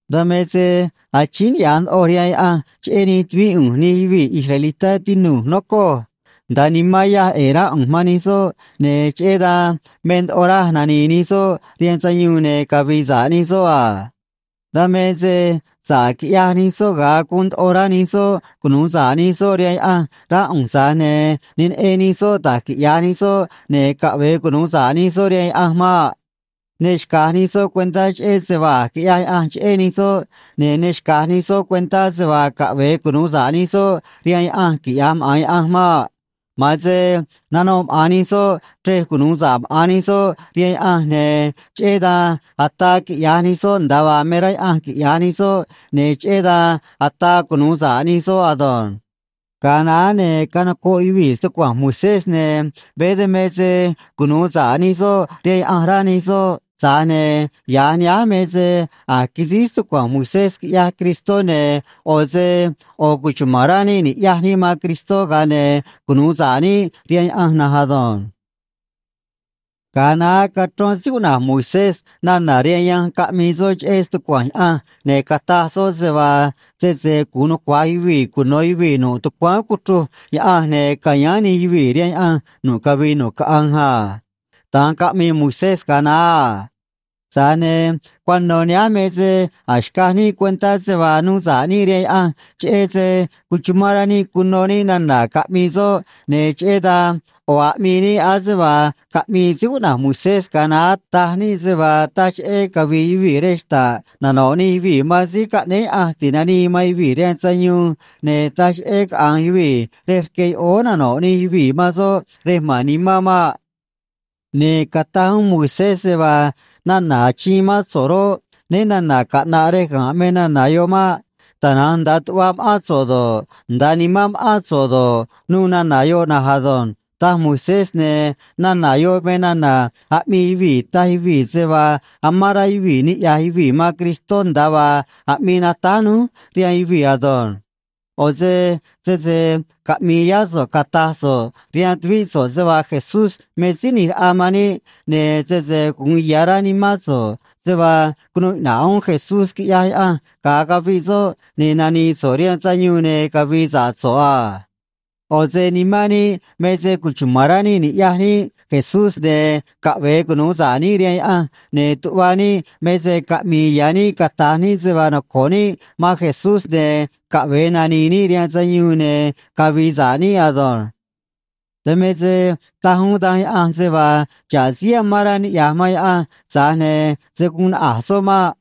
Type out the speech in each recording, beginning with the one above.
Dan me se achíín niꞌya̱j ndoꞌoj rihaan Yaꞌanj cheꞌé nij tuvíꞌ ꞌu̱nj nij yuvii̱ israelitá, tinu̱j, nocoj. Nda̱a nimán yaj ꞌe̱e̱ rá ꞌu̱nj man nij soꞌ, ne̱ cheꞌé dan me ndoꞌo raj nani̱i̱ nij soꞌ rihaan sayuun ne̱ cavi̱i̱ sa̱ꞌ nij soꞌ a. Dan me se sa̱ꞌ quiꞌyaj nij soꞌ ga̱a guun ndoꞌo rá nij soꞌ cunu̱u sa̱ꞌ nij soꞌ rihaan Yaꞌanj, rá ꞌu̱nj, tza̱j ne̱ ne neꞌen nij soꞌ da̱j quiꞌya̱j nij soꞌ ne̱ caꞌve̱e cunu̱u sa̱ꞌ nij soꞌ rihaan Yaꞌanj maꞌ. Ne xca̱j nij soꞌ cuentá cheꞌé se vaa a̱j quiꞌyaj Yaꞌanj cheꞌé nij soꞌ, ne̱ ne xca̱j nij soꞌ cuentá se vaa caꞌve̱e cunu̱u sa̱ꞌ nij soꞌ rihaan Yaꞌanj, quiꞌya̱j maꞌa̱n Yaꞌanj maꞌ. Ma̱an se nanoꞌ maꞌa̱n nij soꞌ chrej cunu̱u sa̱ꞌ maꞌa̱n nij soꞌ rihaan Yaꞌanj, ne̱ cheꞌé dan ataa quiꞌya̱j nij soꞌ nda̱a vaa me rá Yaꞌanj quiꞌya̱j nij soꞌ, ne̱ cheꞌé dan ataa cunu̱u sa̱ꞌ nij soꞌ ado̱nj. Ga̱a naá, ne̱ canocoꞌ yuvii̱ stucua̱nj Moisés, ne̱ veé dan me se cunu̱u sa̱ꞌ nij soꞌ rihaan Yaꞌanj, rá nij soꞌ, tza̱j ne̱ ya̱j nihánj me se a̱j quisíj stucua̱nj Moisés, quiꞌyaj Cristó, ne̱ ꞌo̱ se ꞌo̱ cuchuma̱n rá níꞌ ni̱ꞌyaj níꞌ man Cristó, ga̱a ne̱ cunu̱u sa̱ꞌ níꞌ rihaan Yaꞌanj na̱nj ado̱nj. Ga̱a naá cachrón síí cuꞌna̱j Moisés nana̱ rihaan yanj, caꞌmii soꞌ cheꞌé stucua̱nj Yaꞌanj, ne̱ cataj soꞌ se vaa sese gu̱un nucua̱j yuvii̱ cuno̱ yuvii̱ nu̱ꞌ tucuáán cuchruj Yaꞌanj, ne̱ ca̱yáán nij yuvii̱ rihaan Yaꞌanj nu̱ꞌ cavii nu̱ꞌ caꞌanj a. Da̱nj caꞌmii Moisés ga̱a naá a. Tza̱j ne̱ cuano̱ nihánj me se a̱j xcaj níꞌ cuentá se vaa nuu sa̱ꞌ níꞌ rihaan Yaꞌanj cheꞌé se cuchumán rá níꞌ cuno níꞌ nana̱ caꞌmii soꞌ, ne̱ cheꞌé dan ꞌo̱ aꞌmii níꞌ ase vaa caꞌmii síí cuꞌna̱j Moisés ga̱a naá, taj níꞌ se vaa taj cheꞌé cavi̱i̱ yuvii̱ rej xta̱ꞌ nano̱ꞌ nij yuvii̱ man Síí Caꞌnéé Yaꞌanj Ti̱nanii man Yuvii̱ rihaan Sayuun, ne̱ taj cheꞌé caꞌa̱nj yuvii̱ rej rque yoꞌóó nano̱ꞌ nij yuvii̱ man soꞌ rej ma̱n nimán maꞌ. Ne̱ cataj uún Moisés se vaa nana̱ achiin mán so̱ꞌ roꞌ, né na̱na̱ caꞌna̱ꞌ rej ga̱nꞌ me nana̱ yoꞌ maꞌ. Tana̱nj nda̱a tuꞌva ma̱ꞌán so̱ꞌ do̱ꞌ, nda̱a nimán ma̱ꞌán so̱ꞌ do̱ꞌ, nuû nana̱ yoꞌ na̱nj ado̱nj, taj Moisés, ne̱ nana̱ yoꞌ me nana̱ aꞌmii yuvii̱ taj yuvii̱ se vaa amán rá yuvii̱ niꞌya̱j yuvii̱ man Cristó, nda̱a vaa aꞌmii natáj núj rihaan yuvii̱ ado̱nj. ꞌO̱ se sese caꞌmi̱i̱ yá so̱ꞌ cata̱j so̱ꞌ rihaan tuvíꞌ so̱ꞌ se vaa Jesús me Síí ꞌNi̱j Raꞌa man níꞌ, ne̱ sese gu̱un ya̱ rá nimán so̱ꞌ se vaa cunuu iꞌna̱ꞌ uún Jesús, quiꞌyaj Yaꞌanj, ga̱a caviꞌ soꞌ, ne̱ nani̱i̱ so̱ꞌ rihaan sayuun ne̱ cavi̱i̱ sa̱ꞌ so̱ꞌ a. ꞌO̱ se nimán níꞌ me se cuchuma̱n rá níꞌ ni̱ꞌyaj níꞌ Jesús, ne̱ caꞌve̱e cunu̱u sa̱ꞌ níꞌ rihaan Yaꞌanj, ne̱ tuꞌva níꞌ me se caꞌmi̱i̱ ya̱ níꞌ cata̱j níꞌ se vaa noco̱ꞌ níꞌ man Jesús, ne̱ caꞌve̱e nani̱i̱ níꞌ rihaan sayuun ne̱ cavi̱i̱ sa̱ꞌ níꞌ ado̱nj. Dan me se taj uún Danj Yaꞌanj se vaa xa̱ꞌ síí amán rá niꞌya̱j man Yaꞌanj, tza̱j ne̱ se̱ guun naꞌa̱j soꞌ maꞌ.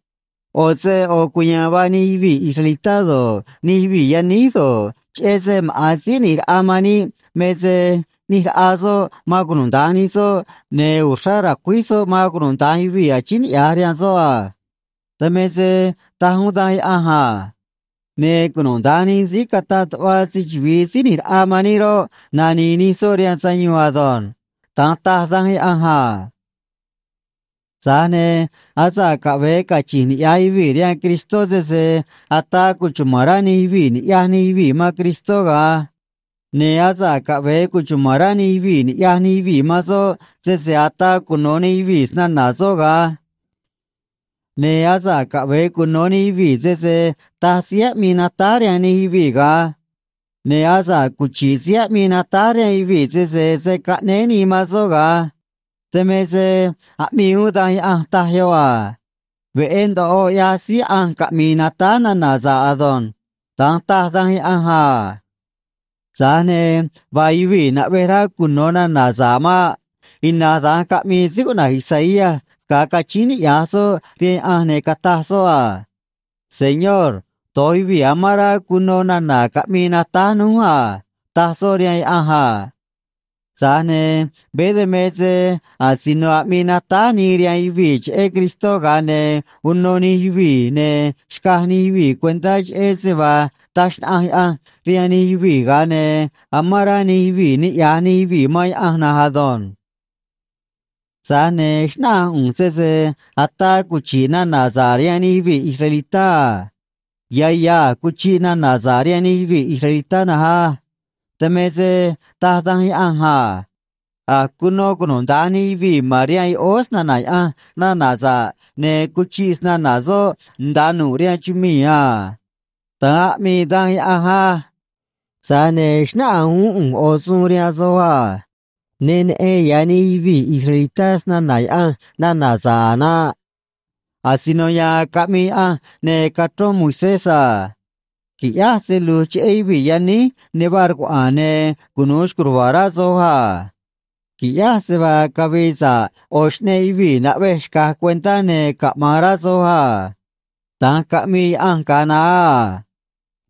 ꞌO̱ se ꞌo̱ cuya̱a̱n vaa nij yuvii̱ israelitá do̱ꞌ, nij yuvii̱ yaníj do̱ꞌ, cheꞌé se maꞌa̱n Síí ꞌNi̱j Raꞌa man níꞌ me se ꞌnij raꞌa soꞌ man cunuda̱nj nij soꞌ, ne̱ uxrá ra̱cuíj soꞌ man cunuda̱nj yuvii̱ achíín niꞌya̱j rihaan soꞌ a. Dan me se taj uún Danj Yaꞌanj a: “Ne̱ cunuda̱nj nij síí cata̱ꞌ tuꞌva se‑chuvi̱i Síí ꞌNi̱j Raꞌa man níꞌ roꞌ, nani̱i̱ nij soꞌ rihaan sayuun ado̱nj.” Da̱nj taj Danj Yaꞌanj a. Tza̱j ne̱ asa̱ꞌ caꞌve̱e cachi̱nj niꞌya̱j yuvii̱ rihaan Cristó, sese ataa cuchuma̱n rá nij yuvii̱ ni̱ꞌyaj nij yuvii̱ man Cristó ga̱an. Ne̱ asa̱ꞌ caꞌve̱e cuchuma̱n rá nij yuvii̱ ni̱ꞌyaj nij yuvii̱ man soꞌ, sese ataa cuno̱ nij yuvii̱ snana̱ soꞌ ga̱an. Ne̱ asa̱ꞌ caꞌve̱e cuno̱ nij yuvii̱, sese taj síí aꞌmii natáj rihaan nij yuvii̱ ga̱an. Ne̱ asa̱ꞌ cuchi̱ꞌ síí aꞌmii natáj rihaan yuvii̱, sese se̱ caꞌnéé nii man soꞌ ga̱an. Dan me se aꞌmii uún Danj Yaꞌanj, taj yoꞌ a: “Veꞌé ndoꞌo ꞌyaj síí ꞌanj caꞌmi̱i̱ natáj nana̱ sa̱ꞌ ado̱nj.” Da̱nj taj Danj Yaꞌanj a. Tza̱j ne̱ vaa yuvii̱ naꞌvej rá cuno̱ nana̱ sa̱ꞌ maꞌ. Ina̱nj da̱nj caꞌmii síí cuꞌna̱j Isaías ga̱a cachíín niꞌya̱j soꞌ rihaan Yaꞌanj, ne̱ cataj soꞌ a: “Señor, do̱j yuvii̱ amán rá cuno nana̱ caꞌmii natáj núj a”, taj soꞌ rihaan Yaꞌanj a. Tza̱j ne̱ veé dan me se asino aꞌmii natáj nii rihaan yuvii̱ cheꞌé Cristó, ga̱a ne̱ uno nij yuvii̱, ne̱ xcaj nij yuvii̱ cuentá cheꞌé se vaa taj xnaꞌanj Yaꞌanj rihaan nij yuvii̱, ga̱a ne̱ amán rá nij yuvii̱ niꞌya̱j nij yuvii̱ man Yaꞌanj na̱nj ado̱nj. Tza̱j ne̱ xnáꞌanj ꞌu̱nj sese ataa cuchi̱ꞌ nana̱ sa̱ꞌ rihaan nij yuvii̱ israelitá a. Ya̱ ya̱ a̱j cuchiꞌ nana̱ sa̱ꞌ rihaan nij yuvii̱ israelitá na̱nj á. Dan me se taj Danj Yaꞌanj a: A̱j cuno cunuda̱nj nij yuvii̱ ma̱n rihaan yoꞌóó snana̱ Yaꞌanj nana̱ sa̱ꞌ, ne̱ cuchiꞌ snana̱ soꞌ nda̱a nu̱ꞌ rihaan chumii̱ a. Da̱nj aꞌmii Danj Yaꞌanj á. Tza̱j ne̱ xnáꞌanj uún ꞌu̱nj ꞌo̱ suun rihaan soj a: Ne neꞌen ya̱ nij yuvii̱ israelitá snana̱ Yaꞌanj nana̱ sa̱ꞌ a̱ naꞌ. Asino ya̱a̱n caꞌmii Yaꞌanj ne̱ cachrón Moisés a: Qui̱ꞌyáj se lu̱j cheꞌé yuvii̱ yaníj ne vaa rcuaꞌa̱a̱n, ne̱ cunu̱u xco̱j ruva̱a̱ rá soj a. Qui̱ꞌyáj se vaa cavi̱i̱ sa̱ꞌ ꞌo̱ xꞌneꞌ yuvii̱ naꞌvej xca̱j cuentá, ne̱ caꞌma̱an rá soj a. Da̱nj caꞌmii Yaꞌanj ga̱a naá a.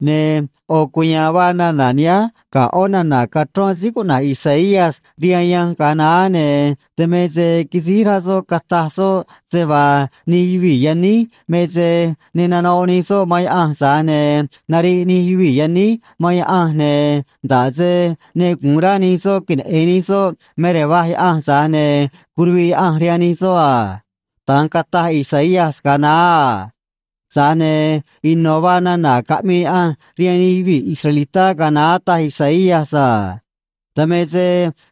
Ne̱ ꞌo̱ cuya̱a̱n vaa nana̱ nihánj ga̱ ꞌó nana̱ cachrón síí cuꞌna̱j Isaías rihaan yanj ga̱a naá, ne̱ dan me se quisíj rá soꞌ cataj soꞌ se vaa nij yuvii̱ yaníj me se ne nanoꞌ nij soꞌ man Yaꞌanj, tza̱j ne̱ nariꞌ nij yuvii̱ yaníj man Yaꞌanj, ne̱ nda̱ꞌ se ne gu̱un rá nij soꞌ queneꞌe̱n nij soꞌ me rej va̱j Yaꞌanj, tza̱j ne̱ curuviꞌ Yaꞌanj rihaan nij soꞌ a. Da̱nj cataj Isaías ga̱a naá a. Tza̱j ne̱ ino̱ vaa nana̱ caꞌmii Yaꞌanj rihaan nij yuvii̱ israelitá ga̱a naá, taj Isaías a. Dan me se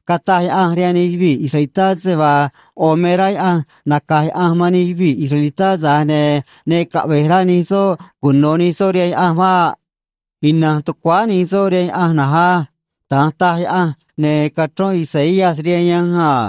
cataj Yaꞌanj rihaan nij yuvii̱ israelitá se vaa ꞌo̱ me rá Yaꞌanj naca̱j Yaꞌanj man nij yuvii̱ israelitá, tza̱j ne̱ ne caꞌve̱j rá nij soꞌ cuno̱ nij soꞌ rihaan Yaꞌanj maꞌ. Ina̱nj tucuáá nij soꞌ rihaan Yaꞌanj na̱nj á. Da̱nj taj Yaꞌanj, ne̱ cachrón Isaías rihaan yanj a.